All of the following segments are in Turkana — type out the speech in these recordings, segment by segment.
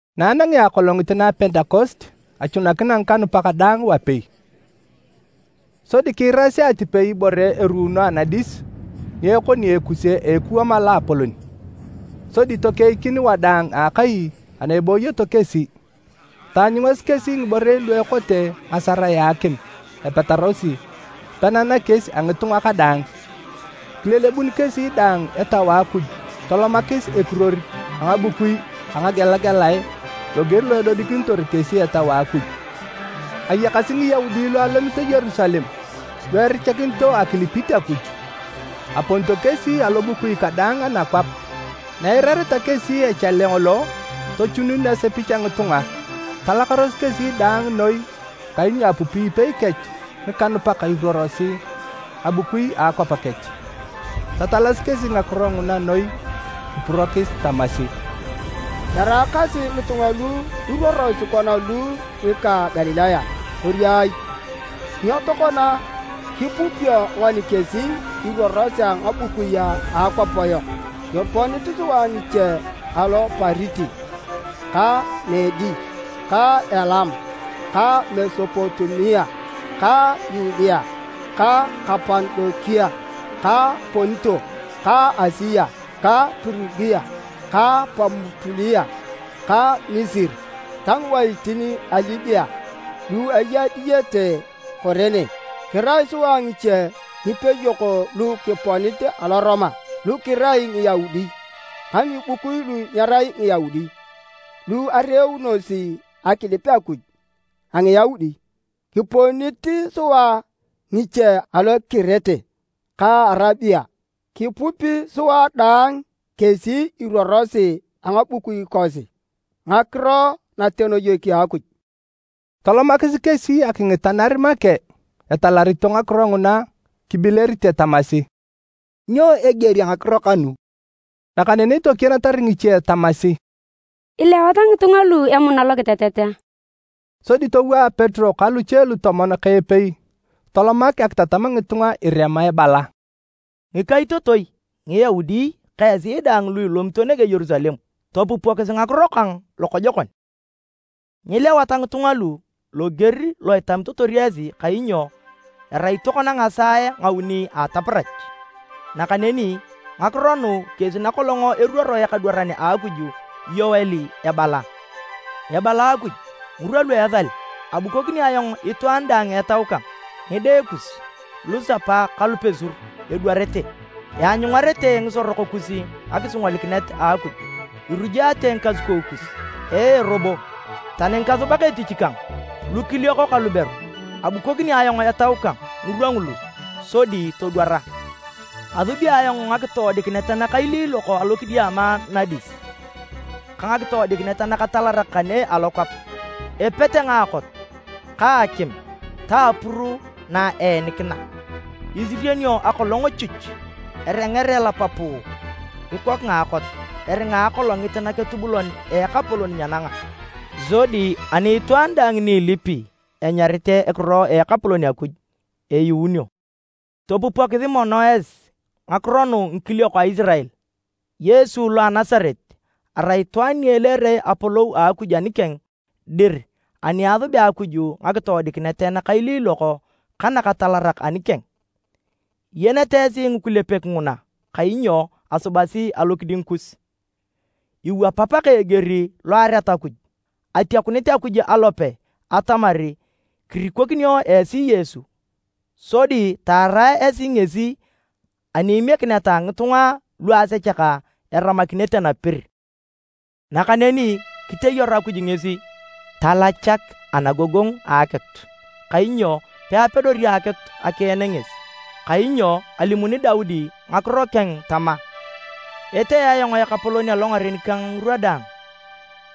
Na anangea akolongit na Pentekost, achunakina ngikanupak daang wapei. Sodi kiirasi atipei ibore eruuno anadis ni ekoni ekuse a ekuwam a loapolon, sodi tokeikin wadaang a akai ana ebooyoto kesi. Taanyungasi kesi ngiborei lu ekote ngasarae a akim epetarosi pena nakies a ngitunga kadaang. Kilelebun kesi daang Etau a Akuj tolomakis ekiruor a ngabukui a ngagelagelae loger lo edodikinitor kesi Etau a Akuj. Ayakasi Ngiyaudi lu alomito Yerusalem lu erichakinito akilipit Akuj, aponito kesi alobukui kadaang anakwap. Na eirareta kesi echale ngolo, tochunun asepich a ngitunga. Talakaros kesi daang noi kainyo apupi ipei kech ngikanupak iruorosi ngabukui a akwap kech. Tatalasi kesi ngakiro nguna noi kipurokis tamasi, “Eraakasi ngitunga lu iruorosi kona lu ngika Galilaya, kori ai? Nyo tokona kipupio ngoni kesi iruorosi a ngabukui a akwap yok? Kiponit sua ngiche alo Pariti ka Medi ka Elam, ka Mesopotamia ka Yudea ka Kapadokia, ka Ponto ka Asia, ka Pirugia ka Pamupulia ka Misiri ta ngiwaitin a Libia lu eya diyete Kurene. Kirai sua ngiche ngipeyok lu kiponit alo Roma, lu kirai Ngiyaudi ka ngibukui lu nyerai Ngiyaudi lu areunosi akilip Akuj a Ngiyaudi. Kiponit sua ngiche alo Kirete ka Arabia, kipupi sua daang kesi iruorosi a ngabukui kosi ngakiro natenoyek a Akuj!” Tolomakis kesi akingitanar make etalarito ngakiro nguna kibilerite tamasi, “Nyo eger a ngakiro kanu?” Nakaneni tokienatar ngiche tamasi, “Ilewat ngitunga lugu emuna lokitetet!” Sodi towaa Petero ka luche lutomon ka epei tolomak akitatam ngitunga irema ebala, “Ngikaitotoi, Ngiyaudi ka esi daang lu ilomito nege Yerusalem, topupokisi ngakiro kang lokojokon. Nyilewat ngitunga lu loger lo itamitotor esi kainyo erai tokona ngisaae nguuni a ataparach. Nakaneni ngakiro nu kesi nakolong eruoro ekadwaran a Akuj Yoel ebala, ‘Ebala Akuj, ngirwa lu esal, abukokini ayong itwaan daang Etau kang. Ngide kus, lusapa ka lupesur, edwarete. Eanyungarete ngisorok kus ngakisingolikinet a Akuj, Irujaate ngikasukou kus. Ee robo, tani ngikasubak etich kang, lukiliok ka luberu, abukokini ayong Etau kang ngirwa ngulu, sodi todwara. Asubi ayong ngakitoodikinet nakailiilok alokidiama nadis ka ngakitoodikinet nakatalarak kane alokwap, epete ngaakot ka akim ta apuru na eenikina. Isirionio akolong chuch, erenger elap puu kikok ngaakot, eringa akolongit naketubulon a Ekapolon nyenanga. Sodi ani itwaan daang ni ilipi enyarit ekiro a Ekapolon Akuj, eyuunio.’ “Topupokisi mono esi ngakiro nu ngikiliok a Isirael! Yesu lo a Nasaret arai itwaan ni eleere apolou a Akuj anikeng dir ani asubea Akuj ngakitoodikinet nakailiilok ka nakatalarak anikeng. Iyenete esi ngikulepek nguna kainyo asubasi alokiding kus. Iwapap ka eger lo ereat Akuj, atiakunit Akuj alope atamar kirikokinio esi Yesu. Sodi taara esi ngesi ani imiekineta ngitunga lu asechak eramakinete napir. Nakaneni kiteyaru Akuj ngesi talachak anagogongu a akitu kainyo peapedori akitu akien ngesi. Kainyo alimuni Daudi ngakiro keng tama, ‘Etee ayong Ekapolon alongaren kang ngirwa daang,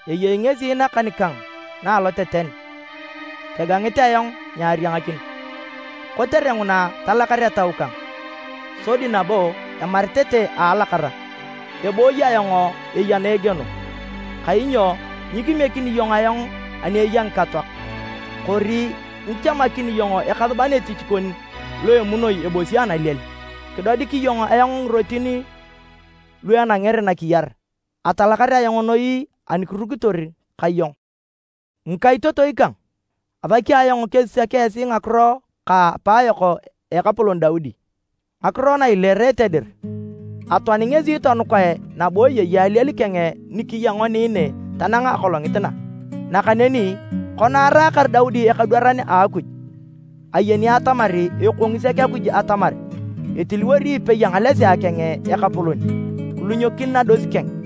eyei ngesi nakan kang na aloteten, kegangit ayong nyariangakin. Kotere nguna, talakar etau kang, sodi nabo emaritete a alakara, ebooyi ayong eya na egieno, kainyo nyikimiekini iyong ayong ani eya ngikatoak, kori nyichamakini iyong ekasuban etich kon lo emunoi ebosi analiel. Kidodik iyong ayong ngirotin lu enangere nakiyar, atalakar ayong noi ani kirukitor ka iyong.’ “Ngikaitotoi kang, asaki ayong kesisak esi ngakiro ka apaayok ekapolon Daudi, ngakiro na ileerete dir. Atoani ngesi tonukae nabo eyei aliel keng ni kiya ngoni ne tanang akolongit na. Nakaneni kona araakar Daudi ekadwaran a Akuj, ayeni atamar ekongi sek Akuj atamar etiliwori epei a ngalesea keng ekapolon, kilunyokin nados keng.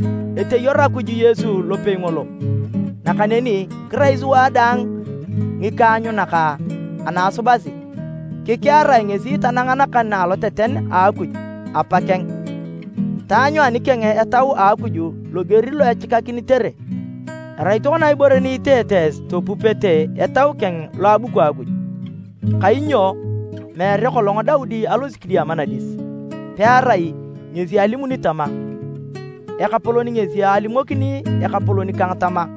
Eteyaru Akuj Yesu lopei ngolo, nakaneni kirai sua daang ngikaanyunak ana asubasi. Kikearae ngesi tanang nakan na aloteten a Akuj, Apa keng, taanyu anikeng Etau a Akuj loger lo echikakinitere. Erai tokona ibore ni iteete esi topupete Etau keng lo abuku Akuj. Kainyo meere kolong Daudi alosi kidiama nadis, pearai ngesi alimuni tama, ‘Ekapolon ngesi alimokini Ekapolon kang tama,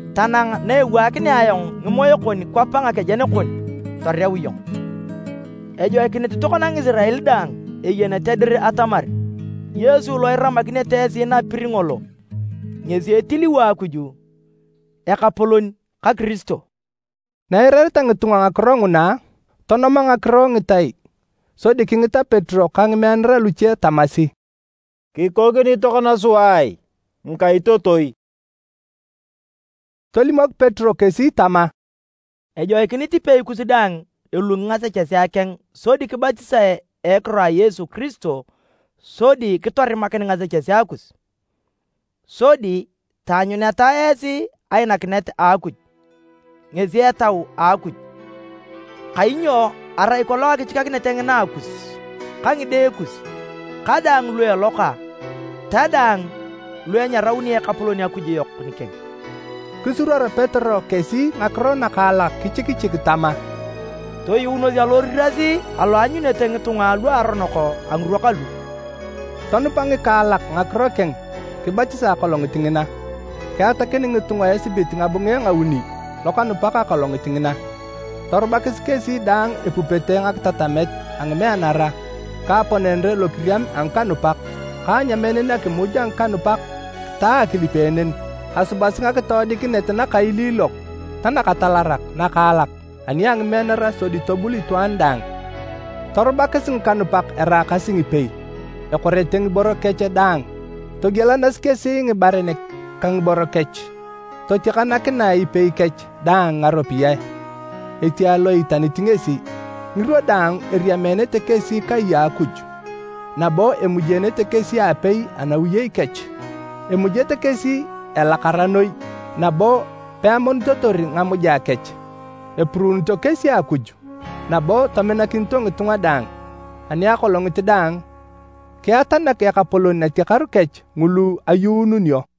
tanang na ewaakinea ayong ngimoe kon kwap nakejen kon toreu iyong.’ “Ejoikinit tokona Ngisirael daang eyenete dir atamar Yesu lo iramakinete esi napir ngolo ngesi etiliwo Akuj, Ekapolon ka Kiristo!” Na eirareta ngitunga ngakiro nguna, tonoma ngakiro ngitai sodi kingita Petero ka ngimeanara luche tamasi, “Kikokini tokona sua ai, ngikaitotoi?” Tolimok Petero kesi tama, “Ejoikinit ipei kus daang elungi ngasechesea keng sodi kibatisae a ekiro a Yesu Kiristo sodi kitorimakin ngasechesea kus, sodi taanyuneta esi ainakinet a Akuj, ngesi Etau a Akuj. Kainyo arai kolong akichikakinet ngina akus, ka ngide kus, ka daang lu eloka, ta daang lu enyarauni Ekapolon Akuj yok nikeng.” Kisuruor Petero kesi ngakiro nakaalak kichikichik tama, “Toyuunos aloriras alo eanyunete ngitunga luaronok a ngirwa kalu!” Tonupa ngikaalak ngakiro keng kibatisae akolongit ngina. Kiatakin ngitunga esibit ngabunge ngauni lokanupak akolongit ngina. Torubakis kesi daang epupete ngakitatamet a ngimeanara ka aponenere lokiriam a ngikanupak ka anyameenen akimuj a ngikanupak ta akilipeenen. Asubasi ngakitoodikinet nakailiilok ta nakatalarak nakaalak ani a ngimeanara sodi tobul itwaan daang. Torubakis ngikanupak eraakasi ngipei, ekorete ngiboro kech daang. Togielanasi kesi ngibaren ka ngiboro kech, totiakanakinae ipei kech daang ngaropiyae, etiae lo iitanit ngesi. Ngirwa daang eriameenete kesi kai a Akuj, nabo emujeenete kesi aapei anawiyei kech. Emujete kesi elakara noi nabo peamonitotor ngamuja kech, epuruunito kesi Akuj, nabo tominakinito ngitunga daang. Ani akolongit daang, kiatanak Ekapolon natiakaru kech ngulu ayuununio.